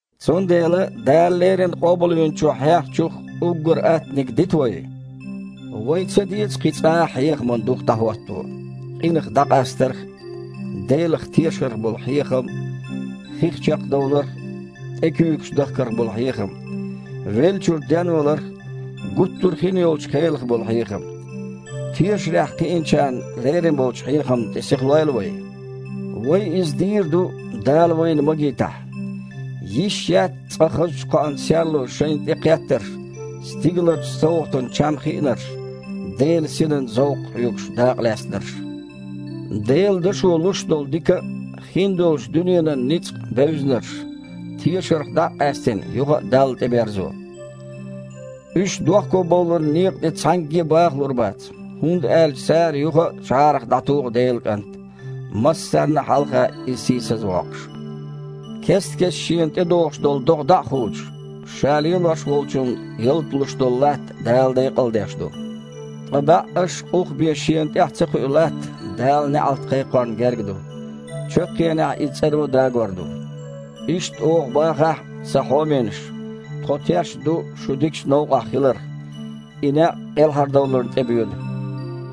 Цундела Дала леррина Къобалвинчо хьехначух уггар аттаниг дита вай. Вайн ца деза кхин цкъа а хьехаман дух дІахІотто: къинах дІакъастарх а, Делах тешарх а болу хьехам, хих чекхдовларх а, тІе куьйгаш дахкарх а болу хьехам, веллачуьра денваларх а, гуттар а хин йолчу кхелах а болу хьехам. Тешарехь кхиинчарна лерина болчу хьехамна тІе сихлойла вай. Вай иза дийр ду, Дала вайна магийтахь. Йиш яц цкъа хазачу кхоан серло шайна тІе кхеттарш, стигаларчу совгІатан чам хиънарш, Делан Синан зовкх хьоьгуш дакъалаьцнарш, Делан Дашо луш долу дика а, хин долчу дуьненан ницкъ а бевзинарш, тешарх дІа а къаьстина, юха а Далла тІеберзо. Уьш дохкобовларан некъа тІе цхьаьнгге а бāхалур бац, хІунда аьлча цара юха а жІарах дІатуху Делан КІант, массарна а хьалха Иза сийсаз а воккхуш. Кест-кеста шена тІедогІуш долу догІа дІа а худуш, ша лелош волчунна ялта луш долу латта Дала декъалдеш ду. Ткъа баьІаш а, къух а бен шена тІехь ца кхуьу латта Дала неІалт кхайкхорна герга ду. Чаккхенехь иза цІаро дагор ду. Иштта оха бахахь а, сан хьоменаш, тхо тешна ду шу дикачу новкъахь хиларх – и некъ кІелхьардовларна тІебоьду.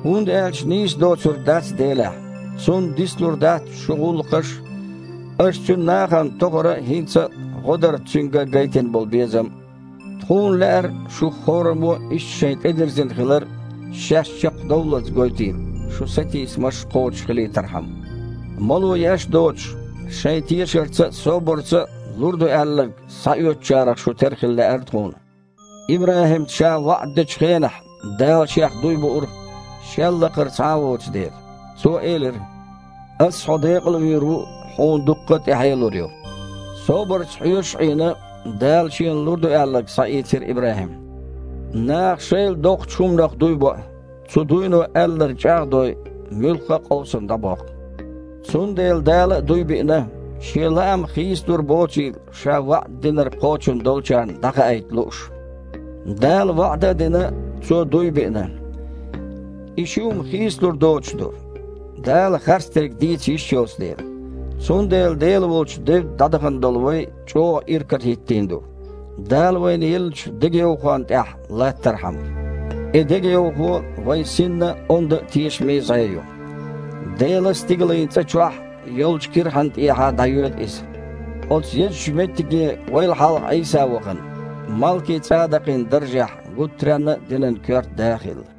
ХІунда аьлча нийса доцург дац Делехь. Цунна дицлур дац шун гІуллакхаш а, аша Цуьнан нахана тохара а, хІинца а гІодарца Цуьнга гайтина болу безам а. Тхуна лаьара, шух хІораммо иштта шайн тІедирзина хилар шаьш чекхдовллалц гойтийла, шун сатийсамаш кхочушхилийтархьама. Мало еш а доцуш, шайн тешарца а, собарца а лур ду аьлларг схьаоьцучарах шу тера хила лаьара тхуна. ИбрахІимна Ша ваІда дечу хенахь, Дала Шех дуй буура, Шел лакхара цхьа а воцу дела. Цо элира: «Аса хьо декъал а вийр ву, хьуна дуккха а тІаьхье а лур ю». Собарца хьоьжуш а Іийна, Дала шена лур ду аьлларг схьаийцира ИбрахІима. Наха шайл а доккхачу хІуманах дуй боу, цу дуйно, аьлларг чІагІ а дой, муьлхха а къовсам дІабоккху. Цундела Дала а дуй биъна, Шен лаам хийцалур боцийла Ша ваІда динарг кхочун долчарна дІахаийта лууш. Дала ваІда а дина, Цо дуй а биъна. И ши хІума хийцалур доцуш ду, Дала харцдерг дийца йиш йоцу дела. Цундела Дела волчу девдда дІадахана долу вай чІогІа иракарахІиттийна ду, Дала вайна еллачу дегайовхонна тІехь латтархьама. И дегайовхо вайн синна онда а, тешаме а зІе ю. Делан стигалийн цІа чохь йолчу кирхьанна тІехьа дІайоьду иза. Оцу езачу меттиге вайл хьалха Іийса вахана, Малки-ЦІадакъин даржехь гуттаренна а динан коьрта да а хилла.